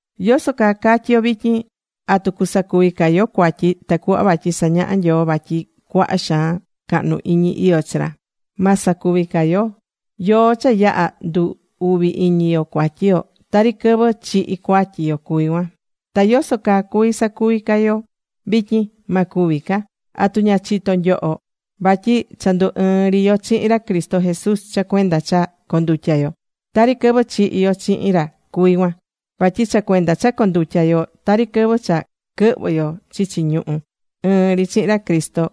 ¿Yoso caa catyi yo vityin? ¿Atu cusacuvi ca yo cuatyi tacuhva vatyi sañaha Nyoo vatyi cuaha xaan tucahnu iñi iyó chi ra? Ma sacuvi ca yo. Yoó cha yaha̱ ndu̱ uvi iñi yo cuatyi yo. Tari quɨvɨ chihi̱ cuatyi yo cuví cuan. Ta ¿yoso caa cuví sacuvi ca yo vityin? Ma cuvi ca. ¿Atu ña chitó nyoho vatyi cha ndu̱ ɨɨn ri yo chihin ra Cristo Jesús cha cuenda cha condutya̱ yo? Tari quɨvɨ chihi̱ yo chihin ra cuví cuan. Vatyi cha cuenda cha condutyá yo, tari quɨvɨ cha quɨhvɨ̱ yo chichi ñuhú ɨɨn ri chihin ra Cristo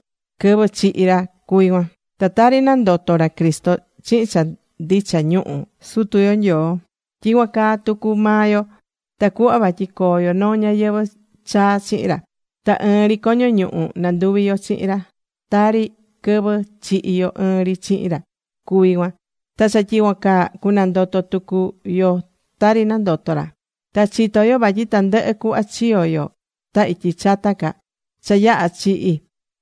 quɨvɨ chihi̱ ra cuví cuan. Ta tari nandoto̱ ra Cristo chihin cha ndicha ñuhu Sutu yo Nyoo, tyicuan caa tucu maa yo, tacuhva vatyi coo yo noo ñayɨvɨ̱ chaa chihin ra. Ta ɨɨn ri coño ñuhu nanduvi̱ yo chihin ra, tari quɨvɨ chihi̱ yo ɨɨn ri chihin ra cuví cuan, ta cha tyicuan caa, cunandoto tucu yo tari nandoto̱ ra. Ta chitó yo vatyi tandɨhɨ cuhva chiyo̱ yo ta ityi chata ca, cha yaha chihi̱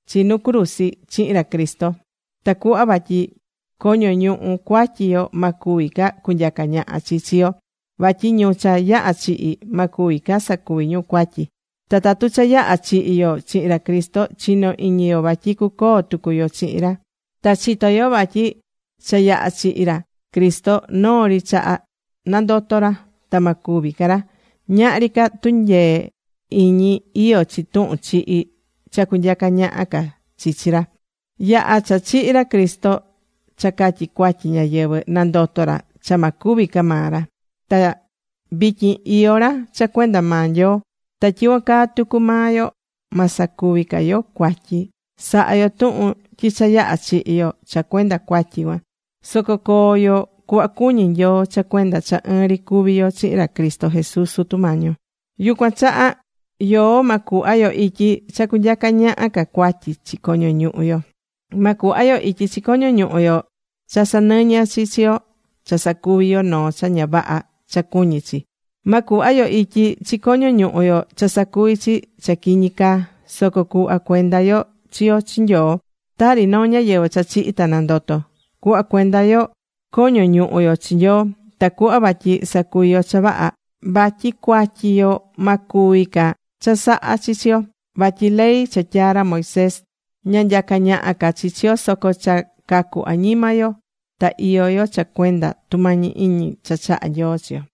chi nu cruzi chihin ra Cristo, tacuhva vatyi coño ñuhu cuatyi yo ma cuvi ca cunyaca ñaha chi chi yo. Vatyi ñu cha yaha̱ chihi̱, ma cuvi ca sacuvi ñu cuatyi. Ta tatu cha yaha̱ chihi̱ yo chihin ra Cristo, chinó iñi yo vatyi cucoo tucu yo chihin ra. Ta chitó yo vatyi cha yaha̱ chihi̱ ra Cristo, noo ri chaha nandoto̱ ra, ta ma cúvi ca ra. Ñahri ca tunyee iñi iyó chi tuhun chihi cha cunyaca ñaha ca chi chi ra. Yaha̱ cha chihi̱ ra Cristo cha catyi cuatyi ñáyɨvɨ, nandoto̱ ra cha ma cúvi ca maa ra. Ta vityin iyó ra cha cuenda maa Nyoo. Ta tyicuan caa tucu maa yo, ma sacuvi ca yo cuatyi. Sa̱ha yo tuhun tyi cha yaha̱ chihi̱ yo cha cuenda cuatyi cuan. Soco co̱o yo cuhva cuñí Nyoo cha cuenda cha ɨɨn ri cuví yo chihin ra Cristo Jesús Sutu Mañi yo. Yucuan chaha yoó ma cuhva yo ityi cha cunyaca ñaha ca cuatyi chi coño ñuhu yo. Ma cuhva yo ityi chi coño ñuhu yo cha sanɨñɨ chi chi yo cha sacuví yo noo cha ña vaha cha cuñí chi. Ma cuhva yo ityi chi coño ñuhu yo cha sacuví chi cha quiñi caa. Soco cuhva cuenda yo chi yo chi Nyoo, tari noo ñáyɨvɨ cha chihi̱ ta nandoto̱. Cu̱hva cuenda yo coño ñuhu yo chi Nyoo tacuhva vatyi sacuvi yo cha vaha. Vatyi cuatyi yo ma cuvi ca chasaha chi chi yo. Vatyi ley cha tyaa̱ ra Moisés, ña nyacá ñaha ca chi chi yo, soco cha cacu̱ añima yo ta iyó yo cha cuenda tumañi iñi cha chahá Nyoo chi yo.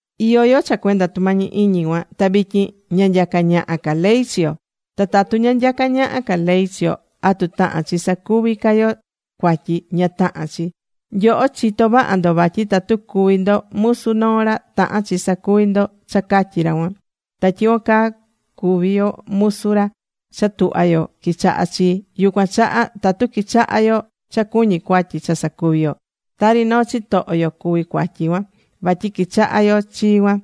Iyó yo cha cuenda tumañi iñi cuan, ta vityin ña nyacá ñaha ca ley chi yo. ¿Ta tatu ña nyaca ñaha ca ley chi yo, atu tahán chi sacuvi ca yo cuatyi? Ña tahán chi. Nyoho chitó vaha ndo vatyi tatu cuví ndo musu noo ra, tahán chi sacuvi ndo cha catyí ra cuan. Ta tyicuan caa cuví yo musu ra cha tuhvá yo quichahá chi. Yucuan chaha tatu quichahá yo cha cuñí cuatyi cha sacuvi yo, tari noo chitoho yo cuví cuatyi cuan, vatyi quichahá yo chi cuan.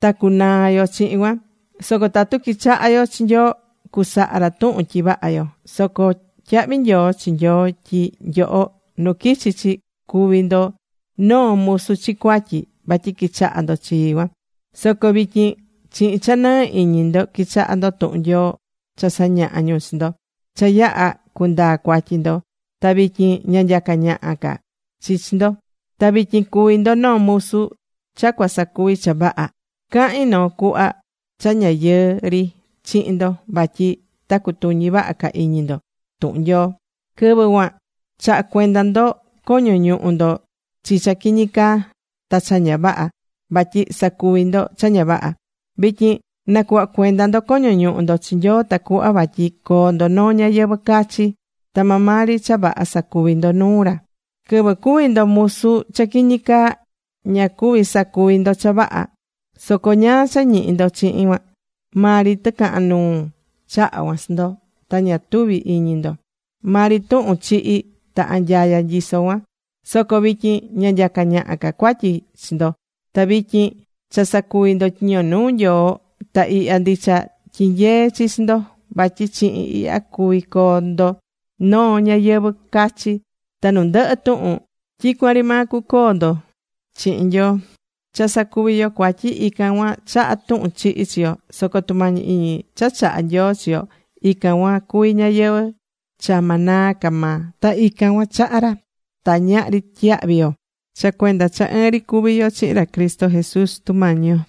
Ta cunaa yo chihin cuan. Soco tatu quichahá yo chi Nyoo, cusaha ra tuhun tyi vaha yo. Soco tyahvi nyoo chi Nyoo, tyi nyoho nu quichi chi cuvi̱ ndo noo musu chi cuatyi vatyi quichaha̱ ndo chi cuan. Soco vityin chihin cha nɨɨ iñi ndo quichahá ndo tuhun Nyoo cha sañahá ñu chi ndo. Cha yaha̱ cundaa̱ cuatyi ndo, ta vityin ña nyacá ñaha ca chi chi ndo. Ta vityin cuví ndo noo musu cha cua sacuvi cha vaha. Cahín noo cuhva cha ña yɨɨ ri chihin ndo vatyi ta cutuñi vaha ca iñi ndo tuhun Nyoo. Quɨvɨ cuan chaha̱ cuenda ndo coño ñuhu ndo chi cha quiñi caa ta cha ña vaha vatyi sacuvi̱ ndo cha ña vaha. Vityin na̱cuhva cuenda ndo coño ñuhu ndo chi Nyoo tacuhva vatyi coo ndo noo ñayɨvɨ̱ cachi, ta maa maa ri cha vaha sa̱cuvi ndo nuu ra. Quɨvɨ cuvi̱ ndo musu cha quiñi caa, ña cuvi̱ sacuvi ndo cha vaha. Soco ¿ñáá cha ñihi̱ ndo chihin cuan? Maa ri tɨcahan nuu chaha̱ cuan chi ndo. Ta ña tuvi̱ iñi ndo. Maa ri tuhun chihi ta anyaya nyisó cuan. Soco vityin ña nyacá ñaha ca cuatyi chi ndo. Ta vityin cha sacuví ndo tyiño nuu Nyoo. Ta ihya ndicha tyinyeé chi chi ndo vatyi chihin ihya cuví coo ndo noo ñáyɨvɨ cachi. Ta nu ndɨhɨ tuhun tyicuan ri maa cucoo ndo chihin Nyoo. Cha sacuví yo cuatyi, ican cuan chahá tuhun chihi chi yo. Soco tumañi iñi cha chahá Nyoo chi yo, ican cuan cuví ñayɨvɨ̱ cha ma naa ca maa. Ta ican cuan chahá ra ta ñahri tyiyahvi yo, cha cuenda cha ɨɨn ri cuví yo chihin ra Cristo Jesús, Sutu Mañi yo.